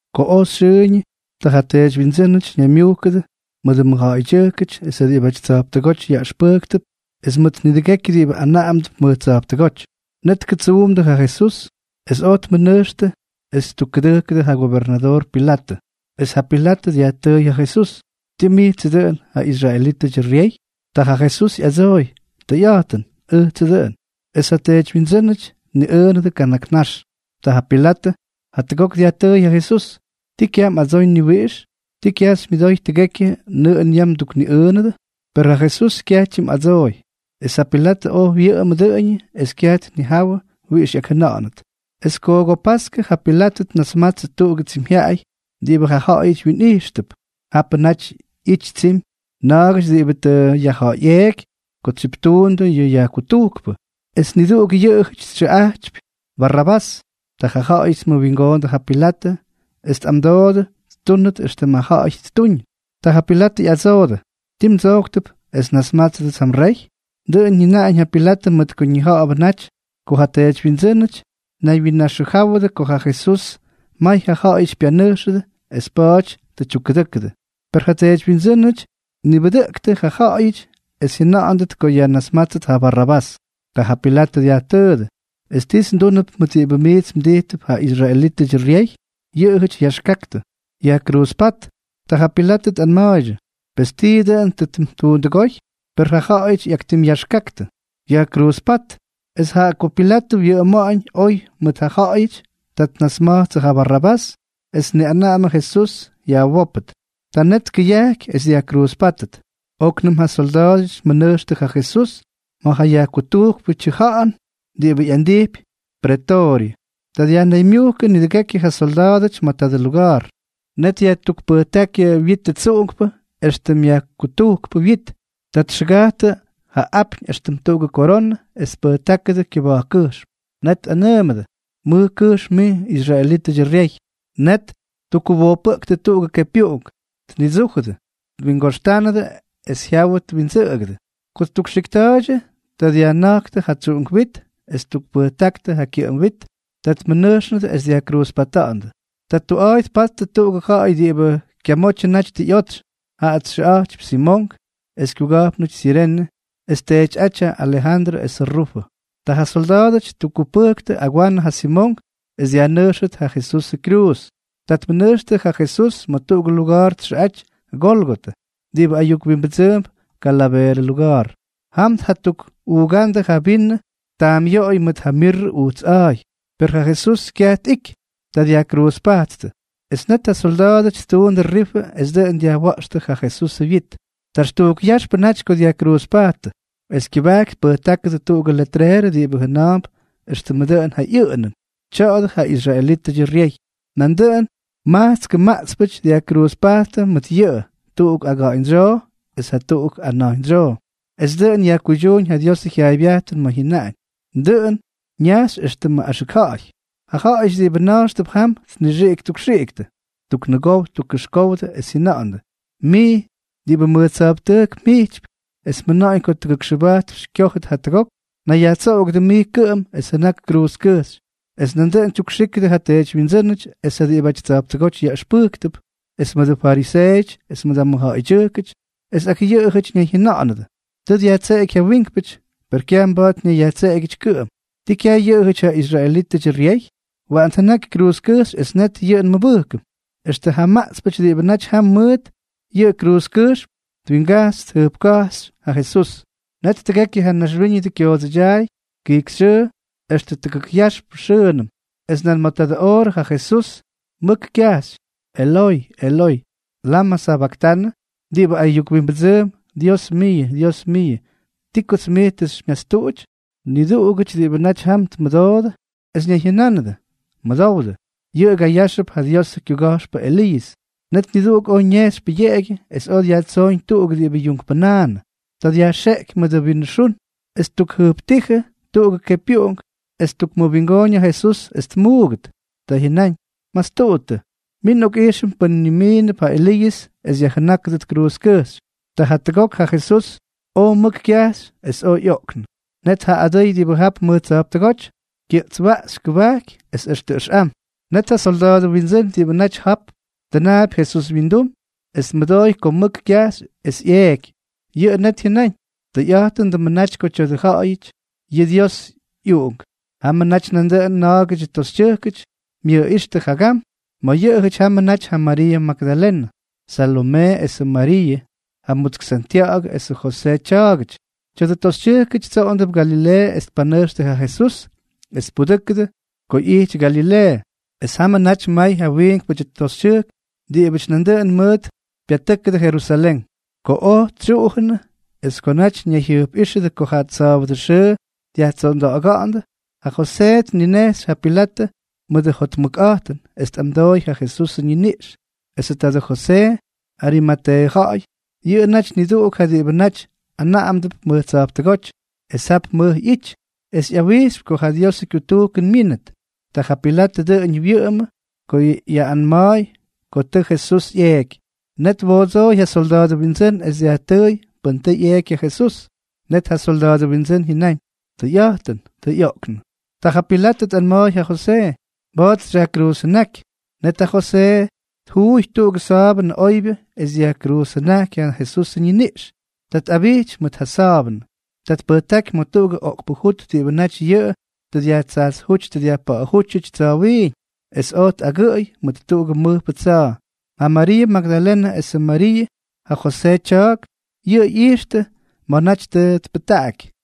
Ko oj xyʉʉñʉ, ta ja teedywyindsʉ́nʉty ñaymyujkʉdʉ mʉdʉ mʉjja̱ꞌa̱ydyʉjkʉty es ja diꞌibʉty tsa̱jptʉgóty yaꞌʉxpʉjktʉp es mʉt nidʉgekyʉ diꞌibʉ anaꞌamdʉp mʉj tsa̱jptʉgóty. Net tkʉtsuumdʉ ja Jesús, es oj tmʉnʉjxtʉ es ttukkʉdʉjkʉdʉ ja gobernadoor Pilatʉ. Es ja Pilatʉ dyajtʉʉy ja Jesús: —¿Tii mijtsʉ dʉꞌʉn ja israelítʉdyʉ ryey? Ta ja Jesús ꞌyadsooy: —Tʉyꞌa̱jtʉn, ʉjtsʉ dʉꞌʉn. Es ja teedywyindsʉ́nʉty tniꞌʉʉnʉdʉ kana̱k nax. Ta ja Pilatʉ jatʉgok dyajtʉʉy ja Jesús: —¿Tii kyaj mꞌadsoy ni wiꞌix? ¿Ti kyaj xymyʉdoy tʉgekyʉ nʉꞌʉn yam mdukniꞌʉʉnʉdʉ? Per ja Jesús kyaj tyimꞌadsooy. Es ja Pilatʉ oj wyʉꞌʉmʉ dʉꞌʉñʉ es kyaj tnijawʉ wiꞌix ꞌyakjʉna̱ꞌa̱nʉt. Es paskʉ paskʉ ja Pilatʉ tnasmatsʉ tuꞌugʉ tsimyjyaꞌay diꞌibʉ ja ja̱ꞌa̱yʉty wyinꞌijxtʉp. Japʉ naty ꞌyittʉ tsimy na̱a̱gʉty diꞌibʉ tʉ yajja̱ꞌa̱yꞌeeky ko tsyiptuundʉ yʉ yajkutujkpʉ, es niduꞌuk yʉꞌʉjʉty xyʉꞌa̱jtypy Barrabás. Ta ja ja̱ꞌa̱yʉty tniwingoondʉ ja Pilatʉ, es tꞌamdoodʉ ttúnʉt éxtʉm jaayʉm ttuñ. Ta ja Pilatʉ ꞌyadsoodʉ: —¿Tii mdsojktʉp es nnasmátsʉdʉts ja mrey? Dʉꞌʉn jyʉnáñ ja Pilatʉ mʉt ko ñija̱ꞌa̱bʉ naty ko ja teedywyindsʉ́nʉty tnaywyinnaxʉjáwʉdʉ ko ja Jesús may ja ja̱ꞌa̱yʉty pyanʉjxʉdʉ es pa̱a̱ty tʉ tyukkʉdʉ́kʉdʉ. Per ja teedywyindsʉ́nʉty tnibʉdʉꞌʉktʉ ja ja̱ꞌa̱yʉty es jyʉna̱ꞌa̱ndʉt ko yajnasmátsʉt ja Barrabás. Ta ja Pilatʉ dyajtʉʉdʉ: —¿Es tits ndúnʉp mʉt diꞌibʉ miits mdijtʉp ja israelítʉdyʉ ryey? Yʉꞌʉjʉty yaxkaktʉ: —¡Yajkruuzpát! Ta ja Pilatʉ tꞌanma̱a̱ydyʉ: —Pes, ¿tii dʉꞌʉn tʉ ttuundʉgóy? Per jaꞌajʉty ꞌyaktimꞌyaxkaktʉ: —¡Yajkruuzpát! Es jaꞌa ko Pilatʉ wyʉꞌʉma̱ꞌa̱ñ oy mʉt ja ja̱ꞌa̱yʉty, ta tnasma̱jtsʉ ja Barrabás es tniꞌanaꞌamʉ esʉ Jesús yajwópʉt. Ta net tkʉyajky es dyajkruuzpáttʉt. Oknʉm ja solda̱a̱dʉty tmʉnʉjxtʉ ja Jesús ma̱ ja yajkutujkpʉ tyʉja̱ꞌa̱n diꞌibʉ ꞌyandijpy pretooryʉ. Ta dyajnaymyujkʉ nidʉgekyʉ ja solda̱a̱dʉty ma̱ tadʉ luga̱a̱r. Net ttukpʉjtáktʉ ja witʉ tsuꞌunkpʉ éxtʉmʉ yajkutujkpʉ wyit. Ta txʉgajttʉ ja apyñ éxtʉm tuꞌugʉ koronʉ es tpʉjtákʉdʉ kyʉba̱jkkʉjxm. Net tꞌanʉʉmʉdʉ: —¡Mʉj kʉjxm mij, israelítʉdyʉ ryey! Net ttukkuwojpʉꞌktʉ tuꞌugʉ kepyuꞌunk, tnidsújʉdʉ, twingoxtánʉdʉ es jyawʉ twindsʉꞌʉgʉ. Ko ttukxikta̱a̱ydyʉ, ta dyajjʉna̱jktʉ ja tsuꞌunk wit es ttukpʉjtáktʉ ja kyʉꞌʉm wit. Ta tmʉnʉjxnʉdʉ es dyajkruuzpata̱ꞌa̱ndʉ. Ta tuꞌa̱a̱y tpattʉ tuꞌugʉ ja̱ꞌa̱y diꞌibʉ kyamotyʉ naty tʉ ꞌyotsy. Jaꞌa xyʉꞌa̱jtypy Simonk es kyuga̱jpnʉty Sirene, es tyeetyꞌátyʉty ja Alejandrʉ esʉ Rufʉ. Ta ja solda̱a̱dʉty ttukkupʉjktʉ agwanʉ ja Simonk es dyajnʉjxʉt ja Jesusʉ kyruuz. Ta tmʉnʉjxtʉ ja Jesús ma̱ tuꞌugʉ luga̱a̱r txʉꞌaty Gólgotʉ, diꞌibʉ ayuk wimbʉdsʉʉmp Kalaveerʉ Luga̱a̱r. Jam tjatukꞌuugándʉ ja vinʉ taamꞌyoꞌoy mʉt ja mirrʉ ujts a̱a̱y, per ja Jesús kyaj tꞌiky. Ta dyajkruuzpajttʉ. Es net ja solda̱a̱dʉty ttuundʉ rifʉ es dʉꞌʉn dyajwa̱ꞌxtʉ ja Jesusʉ wyit. Taxtujk yaxpʉ naty ko dyajkruuzpajttʉ. Es kyʉbajky tpʉjtákʉdʉ tuꞌugʉ letreerʉ diꞌibʉ jʉna̱a̱mp éxtʉmʉ dʉꞌʉn ja ꞌyʉꞌʉnʉn: “Tya̱a̱dʉ ja israelítʉdyʉ ryey.” Nandʉꞌʉn majtskʉ maꞌtspʉty dyajkruuzpajttʉ mʉt yʉꞌʉ, tuꞌuk aga̱ꞌa̱ñdsyoo es jatuꞌuk ana̱jñdsyoo. Es dʉꞌʉn yajkuydyúñ ja Diosʉ jyaaybyajtʉn ma̱ jyʉnaꞌañ: “Dʉꞌʉn ñajxy éxtʉmʉ axʉk ja̱ꞌa̱y.” Ja ja̱ꞌa̱yʉty diꞌibʉ na̱jxtʉp jam tnixiꞌik ttukxiꞌiktʉ, ttuknʉgow ttukꞌyujkówdʉ es jyʉna̱ꞌa̱ndʉ: —Mij diꞌibʉ mʉj tsa̱jptʉjk mjijtypy es mjʉna̱ꞌa̱ñ ko tʉgʉkxʉbajtp xykyojy jatuk ok. Nayyajtsoꞌogʉdʉ mij kʉꞌʉm es jʉnak kruuzkʉjxy. Es nandʉꞌʉn tyukxíkʉdʉ ja teedywyindsʉ́nʉty es ja diꞌibʉty tsa̱jptʉgóty yaꞌʉxpʉjktʉp es mʉdʉ fariseeʉty es ja mʉjja̱ꞌa̱ydyʉjkʉty, es ak yʉꞌʉjʉty ñayjyʉnánʉdʉ: —Tʉ dyajtseꞌeky ja wiinkpʉty, per kyaj mba̱a̱t ñayyajtseꞌegyʉty kʉꞌʉm. ¿Ti kyaj yʉꞌʉjʉty ja israelítʉdyʉ ryey? ¡Waꞌan tjʉnaky kruuzkʉjxy es net yʉꞌʉ nmʉbʉjkʉm! Extʉ ja maꞌtspʉty diꞌibʉ naty jam mʉt yʉꞌʉ kruuzkʉjxm twinga̱jx tjʉjpka̱jxtʉ ja Jesús. Net tʉgekyʉ ja naxwíñʉdʉ kyoodsʉdyaay kijkyxyʉʉ extʉ tʉgʉk yaxp xʉʉnʉm. Es nan ma̱ tadʉ oorʉ ja Jesús mʉk kyajxy: —Eloy, Eloy, ¿lamʉ sabaktanʉ? (diꞌibʉ ayuk wimbʉdsʉʉmp: “Dios miiʉ, Dios miiʉ, ¿ti kots mij tʉ xymyastuꞌuty?”) Niduꞌugʉty diꞌibʉ naty jam tmʉdoodʉ, es ñayjyʉnánʉdʉ: —Mʉdowdʉ, yʉꞌʉga yáxʉp ja Diosʉ kyuga̱jxpʉ Eliiʉs. Net niduꞌuk oj ñejxy pʉyeꞌegyʉ, es oj dyajtsooñ tuꞌuk diꞌibʉ yuunkpʉnaanʉ. Ta dyajxeꞌky mʉdʉ vinʉ xun, es ttukjʉjptíjʉ tuꞌugʉ kepyuꞌunk, es ttukmʉwingooñ ja Jesús es tmuugʉt. Ta jyʉnáñ: —Mastuꞌuttʉ. Min nꞌokꞌijxʉm pʉn nimiinʉp ja Eliiʉs es yajjʉnákʉdʉt kruuzkʉjxy. Ta jatʉgok ja Jesús oj mʉk kyajxy, es oj ꞌyoꞌknʉ. Net ja adʉy diꞌibʉ jap mʉj tsa̱jptʉgóty kyʉꞌtswaꞌxy kʉbajky es extʉ ʉxꞌam. Net ja solda̱a̱dʉ windsʉ́n diꞌibʉ naty jap tʉnaapy Jesús wyindum es tmʉdooy ko mʉk kyajxy es ꞌyeeky, yʉꞌʉ net jyʉnáñ: —¡Tʉyꞌa̱jtʉndʉmʉ naty ko tya̱a̱dʉ yʉꞌʉjʉty ja Diosʉ ꞌyUꞌunk! Jamʉ naty nandʉꞌʉn na̱a̱gʉdyʉ toxytyʉjkʉty myʉjꞌíxtʉ jagam. Ma̱ yʉꞌʉjʉty jamʉ naty ja Mariiʉ Magdalenʉ, Salomee esʉ Mariiʉ, ja mutsk Santya̱ꞌa̱gʉ esʉ Josee tya̱a̱gʉty. Tya̱dʉ toxytyʉjkʉty tsoꞌondʉp Galileeʉ es tpanʉjxtʉ ja Jesús es tpudʉjkʉdʉ ko ꞌyijty Galileeʉ. Es jamʉ naty may ja wiinkpʉdyʉ toxytyʉjk diꞌibʉty nandʉꞌʉn mʉʉt pyatʉ́kʉdʉ Jerusalén. Ko oj tsyuꞌujʉnʉ es ko naty ñayjyʉjpꞌíxʉdʉ ko ja sa̱a̱bʉdʉ xʉʉ dyajtsonda̱ꞌa̱ga̱ꞌa̱ndʉ, ta Josee tninejxy ja Pilatʉ mʉdʉ jotmʉkꞌa̱jtʉn es tꞌamdoy ja Jesusʉ ñiniꞌx. Esʉ tadʉ Josee, Arimateeʉ ja̱ꞌa̱y, yʉꞌʉ naty niduꞌuk ja diꞌibʉ naty anaꞌamdʉp mʉj tsa̱jptʉgóty es jap mʉj ꞌyity, es ꞌyawijxypy ko ja Diosʉ kyutujkʉn myínʉt. Ta ja Pilatʉ dʉꞌʉñʉ wyʉꞌʉmʉ ko yajnima̱a̱y ko tʉ ja Jesús ꞌyeeky. Net twoodsooy ja solda̱a̱dʉ windsʉ́n es dyajtʉʉy pʉn tʉ ꞌyeeky ja Jesús. Net ja solda̱a̱dʉ windsʉ́n jyʉnáñ: —Tʉyꞌa̱jtʉn. Tʉ ꞌyoꞌknʉ. Ta ja Pilatʉ tꞌanma̱a̱y ja Josee: —Mba̱a̱t xyajkruuzjʉnáky. Net ja Josee tjuuy tuꞌugʉ sa̱a̱bʉnʉ oybyʉ es dyajkruuzjʉnajky ja Jesusʉ ñiniꞌx. Ta tꞌabijty mʉt ja sa̱a̱bʉnʉ. Ta tpʉjtáky ma̱ tuꞌugʉ oꞌkpʉ jut diꞌibʉ naty yʉꞌʉ tʉ dyajtsajtsjúty dyajpa̱ꞌa̱jútyʉty tsa̱wiiñ, es oj tꞌagʉꞌʉy mʉt tuꞌugʉ mʉjpʉ tsa̱a̱. Ja Mariiʉ Magdalenʉ esʉ Mariiʉ, ja Josee tya̱a̱k, yʉꞌʉ ꞌyijxtʉ ma̱ naty tʉ tpʉjtaꞌaky.